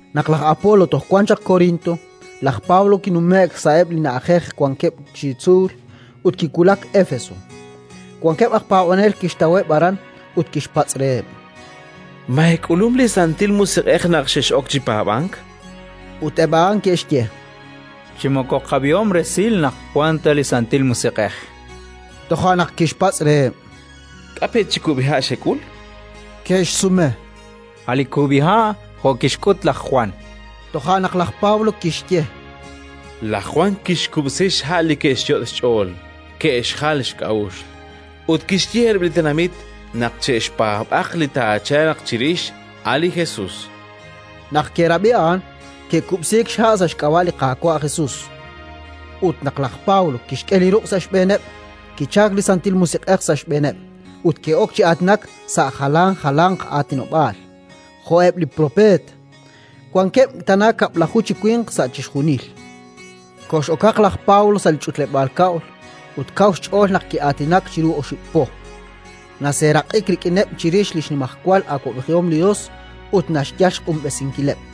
Naq laj Apolo toj wan chaq Korinto, laj Pablo kinume'k sa'eb' li na'ajej wankeb' chi tzuul, ut kiwulak Éfeso. Wankeb' aj paab'anel kixtaweb' aran, ut kixpatz' reheb': —Ma eek'ulum li Santil Musiq'ej naq xex'ok chi paab'ank? chan reheb'. Ut eb' a'an ke'xye: —Chi moko qab'ihom resil naq wank ta li Santil Musiq'ej. Toja' naq kixpatz' reheb': —K'a' pe' chi kub'iha'il xek'ul? Ke'xsume: —A' li kub'iha' jo' kixk'ut laj Jwan, chankeb'. Toja' naq laj Pablo kixye: —Laj Jwan kixkub'si xha' li ke'xyot' xch'ool ke'xjal xk'a'uxl, ut kixye reheb' li tenamit naq che'xpaab'aq li taachalq chirix, a' li Jesus. Naq ke'rab'i a'an, ke'kub'siik xha' sa' xk'ab'a' li Qaawa' Jesus. Ut naq laj Pablo kixk'e li ruq' sa' xb'eeneb', kichalk li Santil Musiq'ej sa' xb'eeneb' ut ke'ok chi aatinak sa' jalan jalanq aatinob'aal, jo'eb' li propeet. Wankeb' tana kab'laju chi winq sa' chixjunil. Kox'okaq laj Pablo sa' li ch'utleb'aal kab'l ut kaw xch'ool naq ki'aatinak chiru oxib' po; naseeraq'ik rik'ineb' chirix li xnimajwal awab'ejihom li Yos ut naxyal xq'unb'esinkileb'.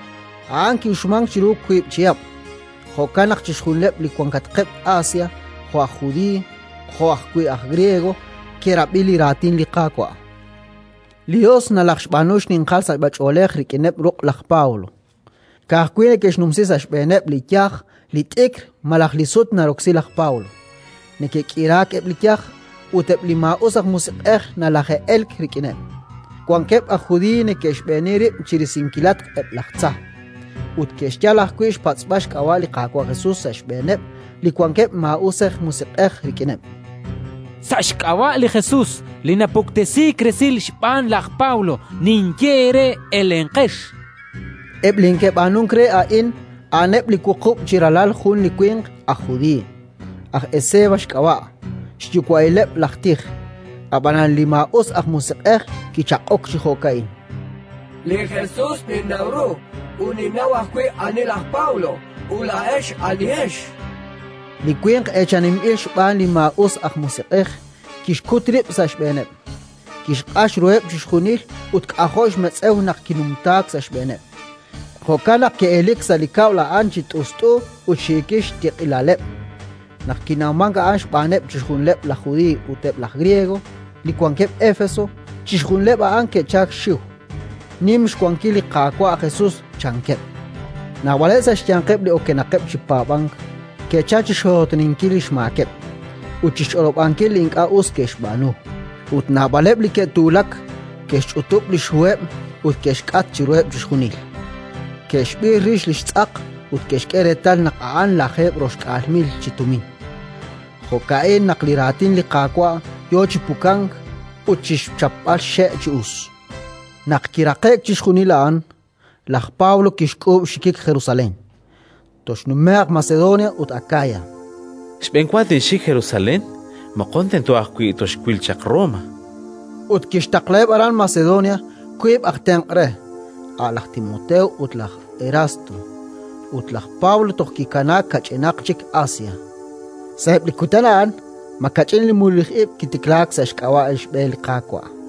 A'an ki'uxmank chiru wiib' chihab'; jo'kan naq chixjunileb' li wankatqeb' Asia, jo' aj Judiiy jo' ajwi' aj Griego, ke'rab'i li Raatin li Qaawa'. Li Yos nalajxb'aanu xninqal sachb'ach'oolej rik'in ruq' laj Pablo: ka'ajwi' neke'xnumsi sa' xb'eeneb' li yaj li t'ikr malaj li sut naroksi laj Pablo, neke'k'iraak eb' li yaj, ut eb' li maa'us aj musiq'ej nalaje'elk rik'ineb'. Wankeb' aj Judiiy neke'xb'eeni rib' chi risinkilatq eb' laj tza, ut ke'xyal ajwi' xpatz'b'al xk'ab'a' li Qaawa' Jesus sa' xb'eeneb' li wankeb' maa'usej musiq'ej rik'ineb': “Sa' xk'ab'a' li Jesus li napuktesiik resil xb'aan laj Pablo ninye eere: Elenqex”, chankeb'. Eb' li neke'b'aanunk re a'in a'aneb' li wuqub' chi ralal jun li winq aj judiiy, aj Esceva xk'ab'a', xyuwa'ileb' laj tij. Ab'anan li maa'us aj musiq'ej kichaq'ok chi jo'ka'in: “Li Jesus ninnaw ru, ut ninnaw ajwi' ani laj Pablo; a'ut laa'ex, anihex?”, chan reheb'. Li winq eechaninb'il xb'aan li maa'us aj musiq'ej kixkut rib' sa' xb'eeneb', kixq'ax ruheb' chixjunil ut k'ajo' xmetz'ew naq kinumtaak sa' xb'eeneb': jo'kan naq ke'elelik sa' li kab'l a'an chi t'ust'u ut xiikil xtiq'ilaleb'. Naq kinawmank a'an xb'aaneb' chixjunileb' laj Judiiy ut eb' laj Griego li wankeb' Éfeso, chixjunileb' a'an ke'chalk xxiw: “Nim xwankil li Qaawa' Jesus”, chankeb'. Naab'aleb' sa' xyanqeb' li okenaqeb' chi paab'ank ke'chalk chi xxootoninkil li xmaakeb' ut chi xch'olob'ankil li ink'a' us ke'xb'aanu; ut naab'aleb' li ke'tuulak ke'xch'utub' li xhuheb' ut ke'xk'at chiruheb' chixjunil. Ke'xb'ir rix li xtz'aq ut ke'xk'e reetal naq a'an lajeeb' roxk'aal mil chi tumin. Jo'ka'in naq li Raatin li Qaawa' yo chi pukank ut chi xchapb'al xxe' chi us. Naq kiraqe'k chixjunil a'an, laj Pablo kixk'uub' xxikik Jerusalén, toxnumje'q Macedonia ut Akaya: “Xb'enwa tinxik Jerusalén, moqon tento ajwi' toxwil chaq Roma”, chan sa' xch'ool. Ut kixtaqlaheb' aran Macedonia wiib' aj tenq' re, a' laj Timoteo ut laj Erasto. Ut laj Pablo toj kikanaak kach'inaq chik Asia. Sa'eb' li kutan a'an makach'in li mululij ib' kitiklaak sa' xk'ab'a' li xB'e li Qaawa'.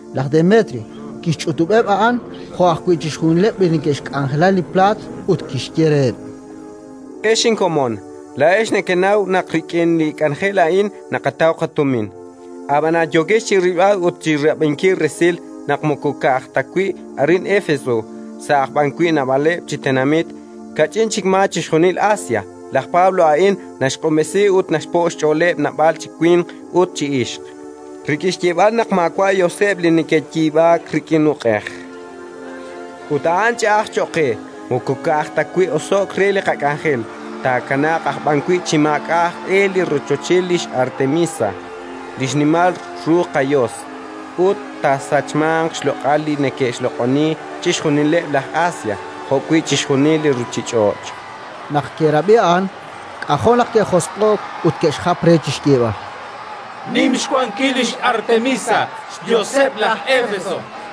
Laj Demetrio kixch'utub'eb' a'an jo' ajwi' chixjunileb' li neke'xk'anjela li plaat, ut kixye reheb': “Ex inkomon, laa'ex nekenaw naq rik'in li k'anjel a'in naqataw qatumin; ab'anan yookex chi rilb'al ut chi rab'inkil resil naq moko ka'aj ta wi' arin Éfeso, sa' aj b'an wi' naab'aleb' chi tenamit, kach'in chik maa chixjunil Asia, laj Pablo a'in naxq'unb'esi ut naxpo' xch'ooleb' naab'al chi winq ut ixq, rik'in xyeeb'al naq maawa' yoseb' li neke'yiib'aak rik'in uq'ej. Ut a'an ch'a'aj cho'q qe: moko ka'aj ta wi' oso'k re li qak'anjel, taakanaaq aj b'an wi' chi maak'a' aj e li rochoch lix Artemisa, li xnimal ru qayos, ut taasachmanq xloq'al li neke'xloq'oni chixjunileb' laj Asia jo'wi' chixjunil li ruuchich'och'”. Naq ke'rab'i a'an, k'ajo' naq ke'josq'o'k ut ke'xjap re chi xyeeb'al: “Nim xwankil lix Artemisa, xyoseb' laj Éfeso!”.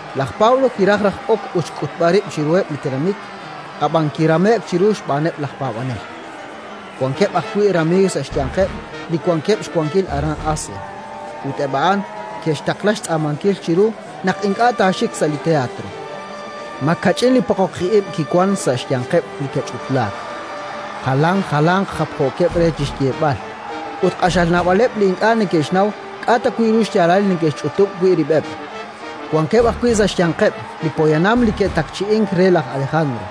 Laj Pablo kiraj raj ok ut xk'utb'al rib' chiruheb' li tenamit, ab'an kirame'k chiru xb'aaneb' laj paab'anel. Wankeb' ajwi' ramiiw sa' xyanqeb' li wankeb' xwankil aran Asia, ut eb' a'an ke'xtaqla xtz'aamankil chiru naq ink'a' taaxik sa' li teatro. Makach'in li poqoqij ib' kiwank sa' xyanqeb' li ke'ch'utlaak, jalan jalanq japjookeb' re chi xyeeb'al, ut q'axal naab'aleb' li ink'a' neke'xnaw k'a' ta wi' ru xyaalal li ke'xch'utub' wi' rib'eb'. Wankeb' ajwi' sa' xyanqeb' li poyanam li ke'takchi'ink re laj Alejandro,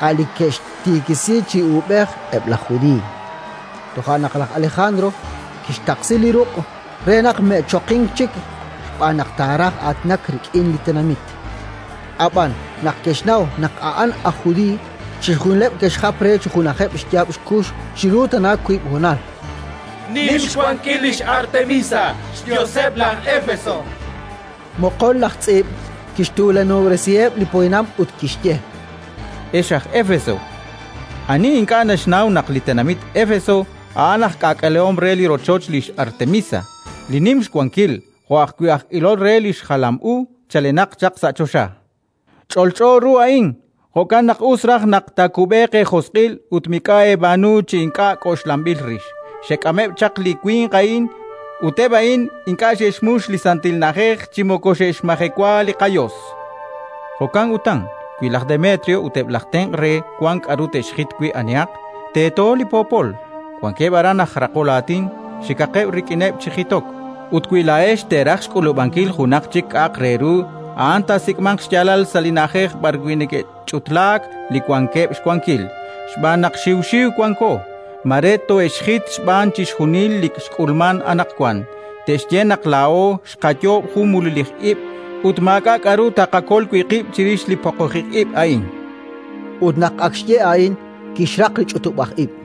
a' li ke'xtiikisi chi uub'ej eb' laj Judiiy. Toja' naq laj Alejandro kixtaqsi li ruq' re naq me'choqink chik xb'aan naq taaraj aatinak rik'in li tenamit. Ab'an naq ke'xnaw naq a'an aj judiiy, chixjunileb' ke'xjap re chi junajeb' xyaab' xkux chiru tana wiib' honal: “Nim xwankil lix Artemisa, xyoseb' laj Éfeso!”, chankeb'. Moqon laj tz'iib' kixtuulanob'resiheb' li poyanam ut kixye: “Ex aj Éfeso, ani ink'a' naxnaw naq li tenamit Éfeso a'an aj k'aak'alehom re li rochoch lix Artemisa, li nim xwankil, jo' ajwi' aj ilol re li xjalam u chalenaq chaq sa' choxa? Ch'olch'o ru a'in. Jo'kan naq us raj naq taakub'eeq eejosq'il ut mik'a' eeb'aanu chi ink'a' k'oxlanb'il rix. Xek'ameb' chaq li winq a'in, ut eb' a'in ink'a' xe'xmux li santil na'ajej chi moko xe'xmajewa li qayos. Jo'kan utan, wi laj Demetrio ut eb' laj tenq' re wank k'aru te'xjit wi' anihaq, teeto li poopol; wankeb' aran aj raqol aatin. Xikaqeb' rik'ineb' chi jitok. Ut wi laa'ex teeraj xk'uub'ankil junaq chik k'a'aq re ru, a'an taasik'manq xyaalal sa' li na'ajej b'arwi' neke'ch'utlaak li wankeb' xwankil. Xb'aan naq xiw xiw wanko: mare toohe'xjit xb'aan chixjunil li xk'ulmank anaqwan; te'xye naq laa'o xqayoob' jun mululij ib', ut maak'a' k'aru taaqakol wi' qib' chirix li poqoqij ib' a'in”. Ut naq ak xye a'in, kixraq li ch'utub'aj ib'.